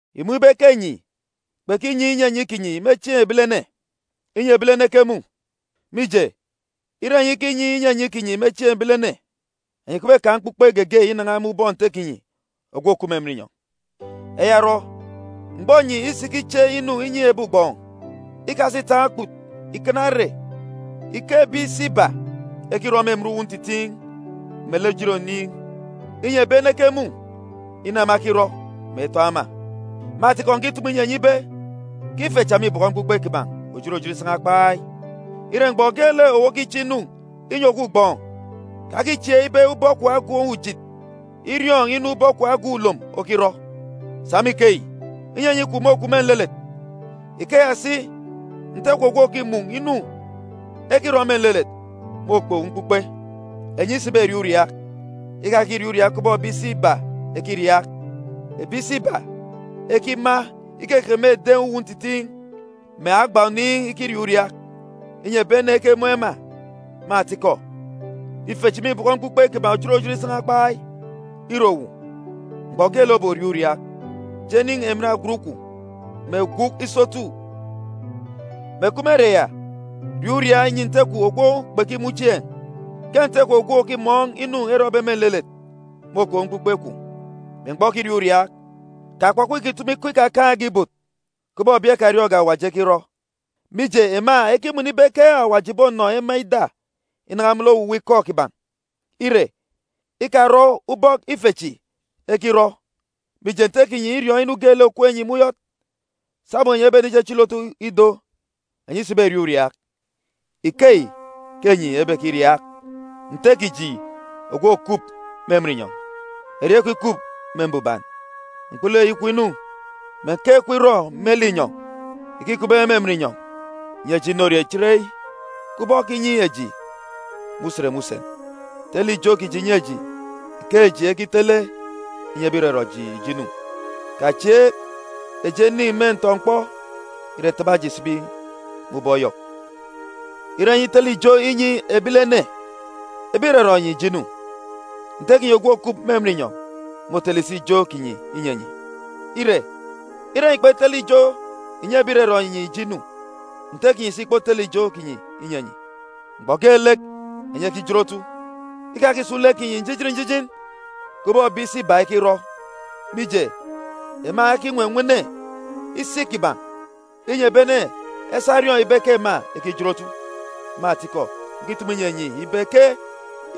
“Ìmun̄ ibe ke enyi kpekinyi inyinyi kinyi me chieen̄ ebilene, inyi ebilene ekemun̄. Mije, ire enyi ikinyi inyinyi kinyi me chieen̄ ebilene, enyi kpebekaan̄ mkpukpe geege inan̄a me ubọk Nte kinyi ogwu òkup me emen inyọn̄. “Eya orọ, mgbọ enyi isikiche inu inyi ebi ugbọọn̄, ikasa ìtaan̄ okput ìkana ere ike ebi isi iba ekirọ me emen uwu ntitiin̄ melek ejit oniin̄, inyi ebi ene ekemun̄ inu ema ekirọ, mè etọn̄ ema. Me atikọ, ǹkitumu inyi enyi ibe ke ife cha mîbọkọ mkpukpe kiban̄ òjot òjot isan̄a kpai. Ire, mgbọ geelek owu okiche inu inyi ogwu ugbọọn̄, kakichieek ibe ubọk kwun̄ agan̄ ujit iriọọn̄ inu ubọk kwun̄ agan̄ ulom okirọ. Sa me ikeyi, inyinyi kwun̄ môkup me nlelet. Ikeya si, Nte kwun̄ ogwu òkimun̄ inu ekirọ me nlelet môkpe owu mkpukpe. “Enyi isiberiaak uriaak, ikakiriaak kubọk ebi isi iba ekiriaak. Ebi isi iba ekima ikekeke me eden̄ uwu ntitiin̄, mè agba oniin̄ ikiriaak uriaak, inyi ebi ene ekemun̄ ema. Me atikọ, ife chi mîbọkọ mkpukpe kiban̄ òjot òjot isan̄a kpai. Ire owu, mgbọ geelek oboriaak uriaak, je nin̄ emen agwut kwun̄, mè gwuk isotu, mè kup me ere ya riaak uriaak nyi Nte kwun̄ ogwu kpekimun̄ chieen̄, ke Nte kwun̄ ogwu òkimọọn̄ inu erọbe me nlelet môkpe owu mkpukpe kwun̄. Me mgbọ okiriaak uriaak, kakpọkpọ ìkitumu ikọ ikakaan̄ge ibot kubọk ebi ekariọọn̄ge Awaji ekirọ, mije, ema ekimọnọ ibe ke Awaji ìbonọ ema ida inan̄a me lek owuwa ikọ kiban̄. Ire, ikarọ ubọk ife chi ekirọ, mije, Nte kinyi îriọọn̄ inu geelek òkup enyi me uyọt sabum enyi ebenichichili otu ido. “Enyi isiberiaak uriaak, ikeyi ke enyi ebekiriaak: “Nte kiji ogwu òkup me emen inyọn̄, erieen̄ kwun̄ ikup me mbuban, mkpulu eyi kwun̄ inu, mè nkeek kwun̄ irọ me linyọn̄, ike îkupbe me emen inyọn̄. Nyi eji inorie chereyi, kubọk okinyi eji me usen me usen. Tele ijo kiji nyi eji, ike eji ekitele inyi ebi ìrọrọ eji ijo inu. Kachieek eji enin̄ me ntọ-mkpọ, ire, taba eji sibi me ubọk Yọk.” “Ire enyi itele ijo inyi ebilene ebi ìrọrọ enyi ijo inu, Nte kinyi ogwu òkup me emen inyọn̄ môtele si ijo kinyi inyi enyi. Ire, ire enyi kpetele ijo inyi ebi ìrọrọ enyi ijo inu, Nte kinyi si ìkpotele ijo kinyi inyi enyi.” “Mgbọ geelek enyi ekijin otu, ikakisun̄ lek kinyi njijin njijin kubọk ebi isi iba ekirọ, mije, ema ekinwenwene isi kiban̄, inyi ebi ene esa eriọọn̄ ibe ke ema ekijin otu. Me atikọ, ǹkitumu inyi enyi ibe ke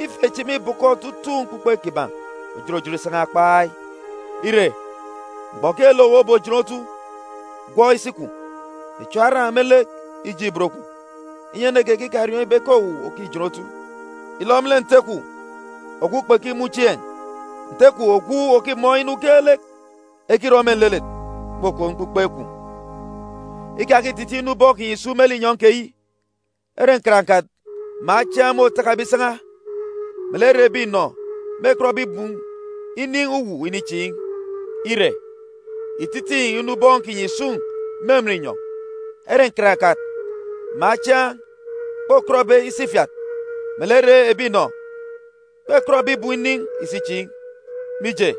ife chi mîbọkọ otutuuk mkpukpe kiban̄ òjot òjot isan̄a kpai. Ire, mgbọ geelek owu obojin otu, gwọk isi kwun̄, mè chiọọk aran̄ me lek ijeek ibot kwun̄, inyi ene geege ikariọọn̄ ibe ke owu òkijin otu, ilọ me lek Nte kwun̄ ogwu kpekimun̄ chieen̄. Nte kwun̄ ogwu òkimọọn̄ inu geelek ekirọ me nlelet môkpe owu mkpukpe kwun̄. “Ikatitiin̄ inu ubọọn̄ kinyi ìsun̄ me linyọn̄ keyi ere nkarankat mè achiaan̄ môtakabe isan̄a, melek ere ebi inọ mêkọtbe ibum inin̄ uwu inichiin̄. Ire, ìtitiin̄ inu ubọọn̄ kinyi ìsun̄ me emen inyọn̄, ere nkarankat mè achiaan̄ kpokọtbe isi ifiat, melek ere ebi inọ kpebekọt ibum inin̄ isi ichiin̄. Mije,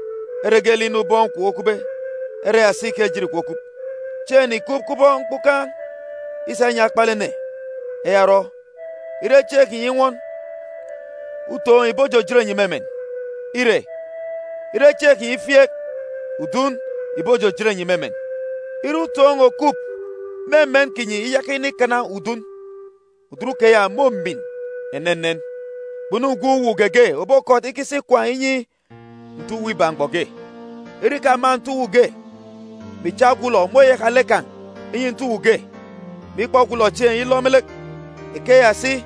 ere geelek inu ubọọn̄ kwun̄ okupbe, ere ya si ke ejit kwun̄ okup. “Chieen̄ ene ìkup kubọk mkpukan̄ isa inyi akpalek ene. Eya orọ, ire chieen̄ kinyi inwọn, utoon̄ ìbojojot enyi me emen. Ire, ire chieen̄ kinyi ifieek, udun ìbojojot enyi me emen. Ire utoon̄ òkup me emen kinyi iyaka inikana udun, udun keya mômin enenen. “Kpunu gwun̄ uwu geege òbokọt ikisi ikwaan̄ inyi nte uwu iba mgbọ ge. Ire ìkama nte uwu ge, mè ìcha ogwulọ, môyaka lek kan̄ inyi nte uwu ge, mè ikpọ ogwulọ chieen̄ ilọ me lek. Ikeya si,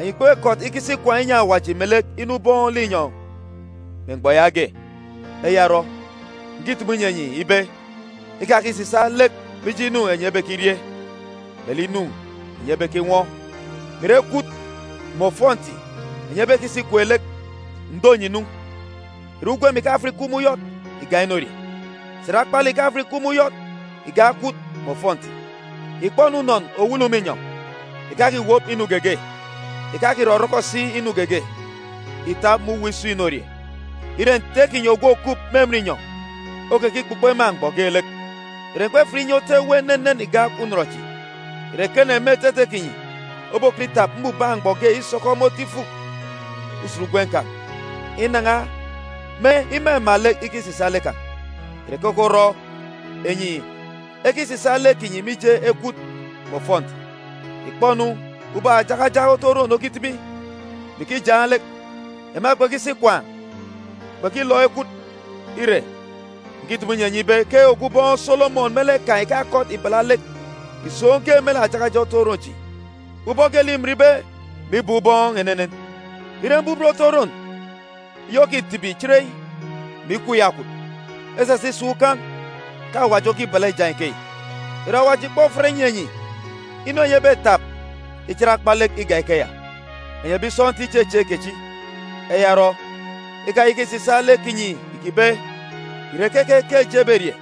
enyi kpebekọt ikisi ikwaan̄ inyi Awaji melek inu ubọọn̄ linyọn̄ me mgbọ yaage. “Eya orọ, ǹkitumu inyi enyi ibe, ikakisisaak lek mije inu enyi ebekirie, melek inu enyi ebekinwọ, mè ìre ekwut mè ofọnti enyi ebekisa ikwek lek. Ǹdo enyi nu, ìre ugwem ìkafat ìkup me uyọt ìgak inorie? Sà ìre akpalek ìkafat ìkup me uyọt ìgak ekwut mè ofọnti? Ìkpọ-nu unọn òwulu me inyọn̄, ìkakiwop inu geege, ìkakirọrọkọ si inu geege ìtap me uwu isun̄-inorie. Ire, Nte kinyi ogwu òkup me emen inyọn̄ okekikpukpo ema mgbọ geelek. Ìre enyi kpefat inye otu ewe enenen igak unọn chi? Ìre ekene me etete kinyi obokọt itap mbubak mgbọ ge isọkọ me otu ifuk usen ugwem kan̄ inan̄a me imama lek ikisisaak lek kan̄? “Ìre keke orọ enyi ekisisaak lek kinyi mije ekwut mè ofọnti? Ìkpọ-nu ubọk ajakajak otu oron okitibi, mè ikijaan̄ lek. Ema kpekisi ikwaan̄, kpekilọk ekwut. Ire, ǹkitumu inyi enyi ibe ke ogwu ubọọn̄ Solomọn me lek kan̄, me otutuuk òrirọ kan̄, ìkakọt ìbala lek ìsoon̄ ge me lek ajakajak otu oron chi, ubọk geelek îminbe mè ibọọn̄ ubọọn̄ enenen. Ire mbubet otu oron eyi òkitibi chereyi, mè ikwu iyakwut, esasa isọk ukan̄, ke Awaji okibala ijaan̄ ikeyi, ìre Awaji ìkpofat inyi enyi inu enyi ebetap ichit akpa lek igak ikeya? Enyi ebi sọntiik ichechieek kechi! Eya orọ ikayaka ìkisisaak lek kinyi ìkibe, ‘Ìre keke ke eji eberie?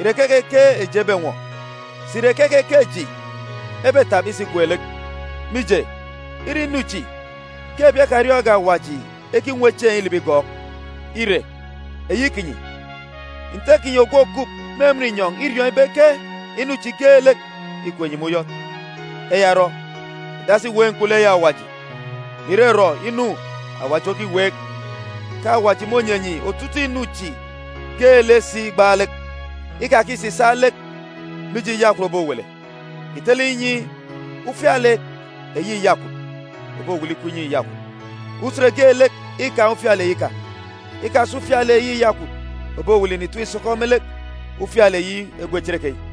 Ìre keke ke eji ebenwọ? Sà ìre keke ke eji ebetap isa ikwek lek?’ Mije, îre inu chi ke ebi ekariọọn̄ge Awaji ekinwe chieen̄ ilibi igọọk. Ire, eyi kinyi, Nte kinyi ogwu òkup me emen inyọn̄ îriọọn̄ ibe ke inu chi geelek îkup enyi me uyọt. Eya orọ, ìdasi ìweek mkpulu eyi Awaji, mè irọrọ inu Awaji okiweek, ke Awaji mônyi enyi otutuuk inu chi geelek si igbaalek. Ikakisisaak lek mije iyakwut òbowele. Ìtele inyi ufialek eyi iyakwut òbowele ikup inyi iyakwut. Usen geelek îkaan̄ ufialek eyi kan̄. Ikasa ufialek eyi iyakwut òbowele ìnitap ìsọkọ me lek ufialek eyi egwe cherekeyi.